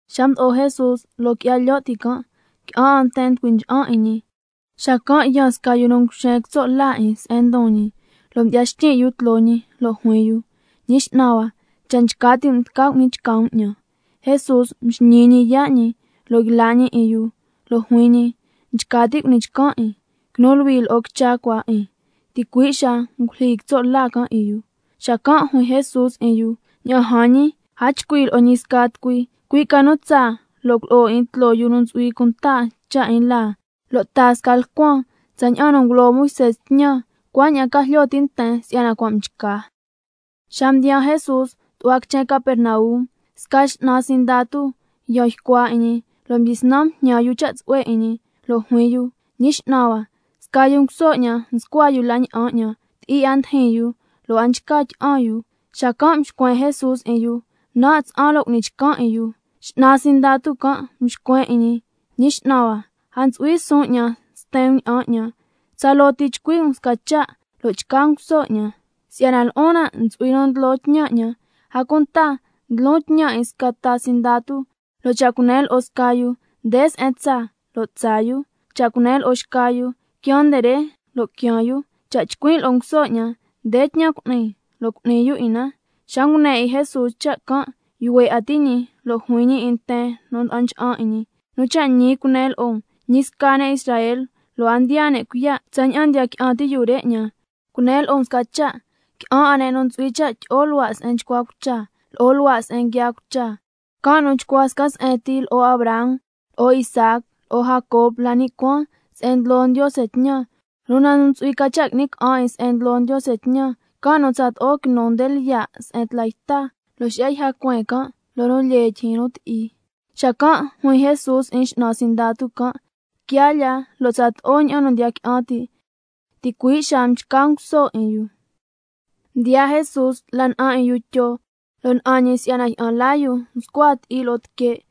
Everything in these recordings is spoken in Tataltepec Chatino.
Xa mdo'o Jesús loo qui'ya lyo' ti can', qui'an 'a nten mducui ncha'an 'in ñi. Xacan' yaan sca yu nu nguxen quitso' la 'in se'en ndon ñi, lo' mdyi'ya xtyin' yu tloo ñi lo' juin yu: Ñi X'nan hua, cha' nchca ti' um tca cu'ni chca um 'ñan. Jesús mxñii ñi yaa' ñi lo' yla' ñi 'in yu, lo' juin ñi: Nchca tin' cu'ni chcan 'in, quinu luhui lo'o quicha cua 'in. Ticui' xaa ngulyijyi quitso' la can' 'in yu. Xacan' juin Jesús 'in yu: Ña'an jan ñi, a chcui' lo'o ñi sca tucui, cui' ca nu tsaa lo' culo'o 'in tloo yu nu ntsu'hui cunta cha' 'in laa, lo' taa sca lcuan tsaña'an nu ngulo Moisé tñan, cuaña'an ca jlyo ti' nten si'yana cua' mchca. Xa mdiyaa Jesús tu'hua quichen Capernaum, sca x'nan sindatu yan ycua 'in ñi, lo' mdyisnan mjñan yu cha' tsu'hue 'in ñi, lo' juin yu: Ñi X'nan hua, sca yu nguso 'ñan nscua yu la na'an 'ñan, ti'i 'a ndijin yu lo' a nchca tyi'an yu. Xacan' mxcuen Jesús 'in yu: Nan' tsa'an lo' cu'ni chcan 'in yu. X'nan sindatu can' mxcuen 'in ñi: Ñi X'nan hua, a ntsu'hui suun 'ñan sten um ña'an 'ñan, tsaloo ti chcui' um sca cha' lo' chca nguso 'ñan. Si'yana lo'on nan' ntsu'hui nu ndlo tñan 'ñan, a cunta ndlon tñan 'in sca ta sindatu, lo' cha' cunen lo'o sca yu: Nde se'en tsaa, lo' tsaa yu. Cha' cunen lo'o xca yu: Quiaan nde re, lo' quiaan yu. Cha' chcuin' lo'o nguso 'ñan: Nde tñan cu'ni, lo' cu'ni yu 'in na. Xa ngune 'in Jesús cha' can', yuhue 'a ti' ñi lo' juin ñi 'in nten nu nda'an ncha'an 'in ñi: Nu cha' ñi cunen lo'o um, ñi sca ne' Israel, lo' a ndiyaa ne' cuiya' tsaña'an ndiya qui'an ti' yu re 'ñan. Cunen lo'o um sca cha', qui'an 'a ne' nu ntsu'hui cha' tyi'o luhua' se'en nchcua cucha, lo'o luhua' se'en nguiaa cucha, can' nu chcua sca se'en ti lo'o Abraham, lo'o Isaac, lo'o Jacob la ni' cuaan se'en ndlo Ndiose tñan. Una nu ntsu'hui ca cha' qui'ni ca'an 'in se'en ndlo Ndiose tñan, can' nu tsato'o quinu nde lyiya' se'en tla yta, lo' xi'ya yja cueen can' loo nu lyee tyijyin nu ti'i. Xacan' juin Jesús 'in x'nan sindatu can': Quia lya, lo' tsato'o ña'an nu ndiya qui'an ti'. Ticui' xaa mchca nguso 'in yu. Mdiyaa Jesús la na'an 'in yu Tyo, lo' na'an ñi si'yana jyi'an laa yu nscua ti'i lo'o tique'.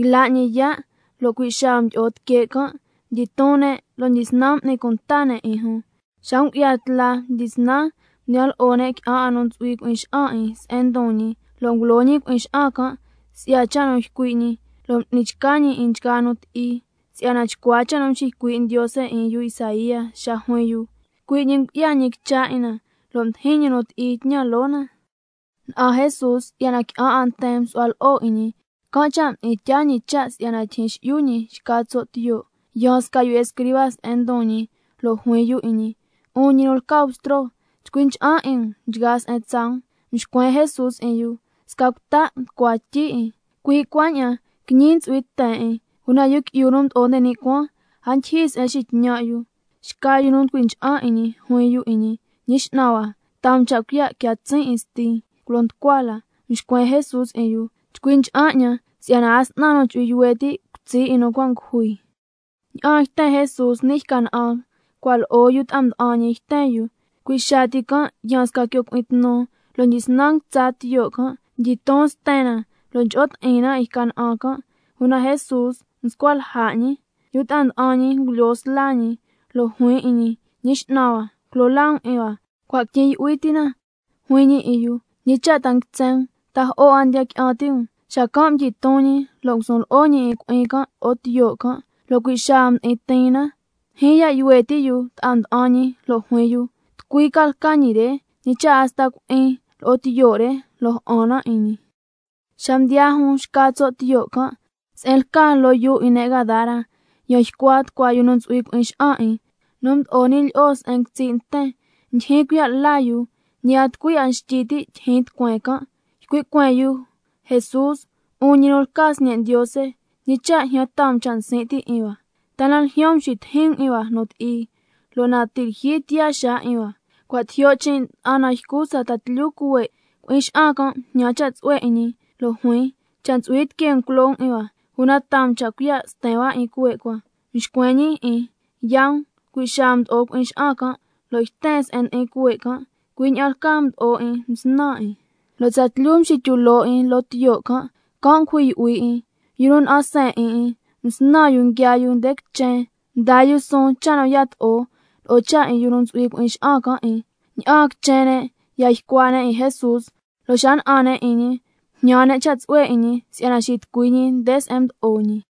Yla' ñi yaa', lo' cui' xaa mdyi'o tique' can', mdyiton ne' lo' mdyisnan m'ni cunta ne' 'in jun. Xa ngu'ya tla mdyisnan mdiyan lo'o ne' qui'an 'a nu ntsu'hui cui'in xa'an 'in se'en ndon ñi, lo' ngulo ñi cui'in xa'an can' si'ya cha' nu ycui' ñi, lo' m'ni chca ñi 'in nchgaa nu ti'i, si'yana chcua cha' nu mxiycui' Ndiose 'in yu Isaía xa juin yu: —Cui' ñi ngu'ya ñi quicha 'in na, lo' mdijin ñi nu ti'i tñan loo na—. Na'an Jesús si'yana qui'an 'a nten msu'hua lo'o 'in ñi, can' cha' mdi'in tyaa ñi cha' si'yana tyijyin xi'yu jun xca tso' tiyo'. Yaan sca yu escriba se'en ndon ñi lo' juin yu 'in ñi: 'Un ñi nu lca Bstro, chcui ncha'an 'in um nchgaa se'en tsaa um. Mxcuen Jesús 'in yu: Sca cuta' nducua tyi 'in, cui' cuaña'an quiñi ntsu'hui ten 'in, una Yu Qui'yu nu Mdo'o nde ni' Cuaan, a ndyijyi se'en nxitñan' yu. Xca yu nu nducui ncha'an 'in ñi juin yu 'in ñi: Ñi X'nan hua, taa um cha' cuiya' quia tsin' 'in stin culo nducua la. Mxcuen Jesús 'in yu: Chcui ncha'an 'ñan, si'yana a s'nan nu chu'hui yuhue' ti' cutsi' 'in nu cua' ngujui. Ña'aan yten Jesús ni' yca na'an, cua' lo'o yu ta'a nda'an ñi yten 'in na. Cui' xaa ti can' yaan sca quio cui'in tnu, lo' mdyisnan nguitsa tiyo' can', mdyiton sten na lo' ncho'o ti'in na 'in yca na'an can', una Jesús nscua lja' ñi. Yu ta'a nda'an ñi ngulyoo sla ñi lo' juin 'in ñi: ¡Ñi X'nan hua, culo laa um 'in hua, cua' quityin' yu'hui ti na! Juin ñi 'in yu: ¿Ñi cha' ta nguitsen um, ta jo'o 'a ndiya qui'an ti' um? Xacan' mdyiton ñi, lo' ngusun lo'o ñi 'in cui'in can' lo'o tiyo' can', lo' cui' xaa mdi'in tiin na. Ndyijyin ya' yuhue ti' yu ta'a nda'an ñi lo' juin yu: ¿Tucui ca lca ñi re, ñi cha' hasta cui'in lo'o tiyo' re, lo' ja'an na 'in ñi? Xa mdiyaa jun xca tso' tiyo' can' se'en lca loo yuu 'in ne' Gadara, yan ycua tucua yu nu ntsu'hui cui'in xa'an 'in, nu mdo'o ni' lyi'o se'en nguitsi' nten, ndyijyin cuiya' la yu, ñi a tucui 'a xtyi ti' tyijyin tucueen can'. Ycui' cueen yu: Jesús, 'un ñi nu lca Sñe' Ndiose, ¿ñi cha' ljyan taa um cha' nsin' ti' 'in hua? ¿Ta na ljyaan um xitijin um 'in hua nu ti'i, lo' na ti' lyijyi tiyaa xaa 'in hua? Cua' tijyo' chin' nda'an nan ycu sca ta tlyu cuhue'. Cui'in xa'an can' mjñan cha' tsu'hue 'in ñi, lo' juin: Cha' ntsu'hui tiquee um culo um 'in hua, una taa um cha' cuiya' sten hua 'in cuhue' cua. Mxcuen ñi 'in: Yaa um. Cui' xaa mdo'o cui'in xa'an can' lo' yten se'en ndi'in cuhue' can', cui' ña'an lcaa mdo'o 'in msnan 'in, lo' tsatlyu mxityu loo 'in loo tiyo' can', can' ngujui yu'hui 'in. Yu nu na'an seen 'in 'in, msnan yu nguiaa yu nde quichen, mdaa yu suun cha' nu yato'o, lo'o cha' 'in yu nu ntsu'hui cui'in xa'an can' 'in. Ña'aan quichen ne' ya ycua ne' 'in Jesús. Lo' xa na'an ne' 'in ñi, mjñan ne' cha' tsu'hue 'in ñi si'yana xitucui ñi nde se'en mdo'o ñi.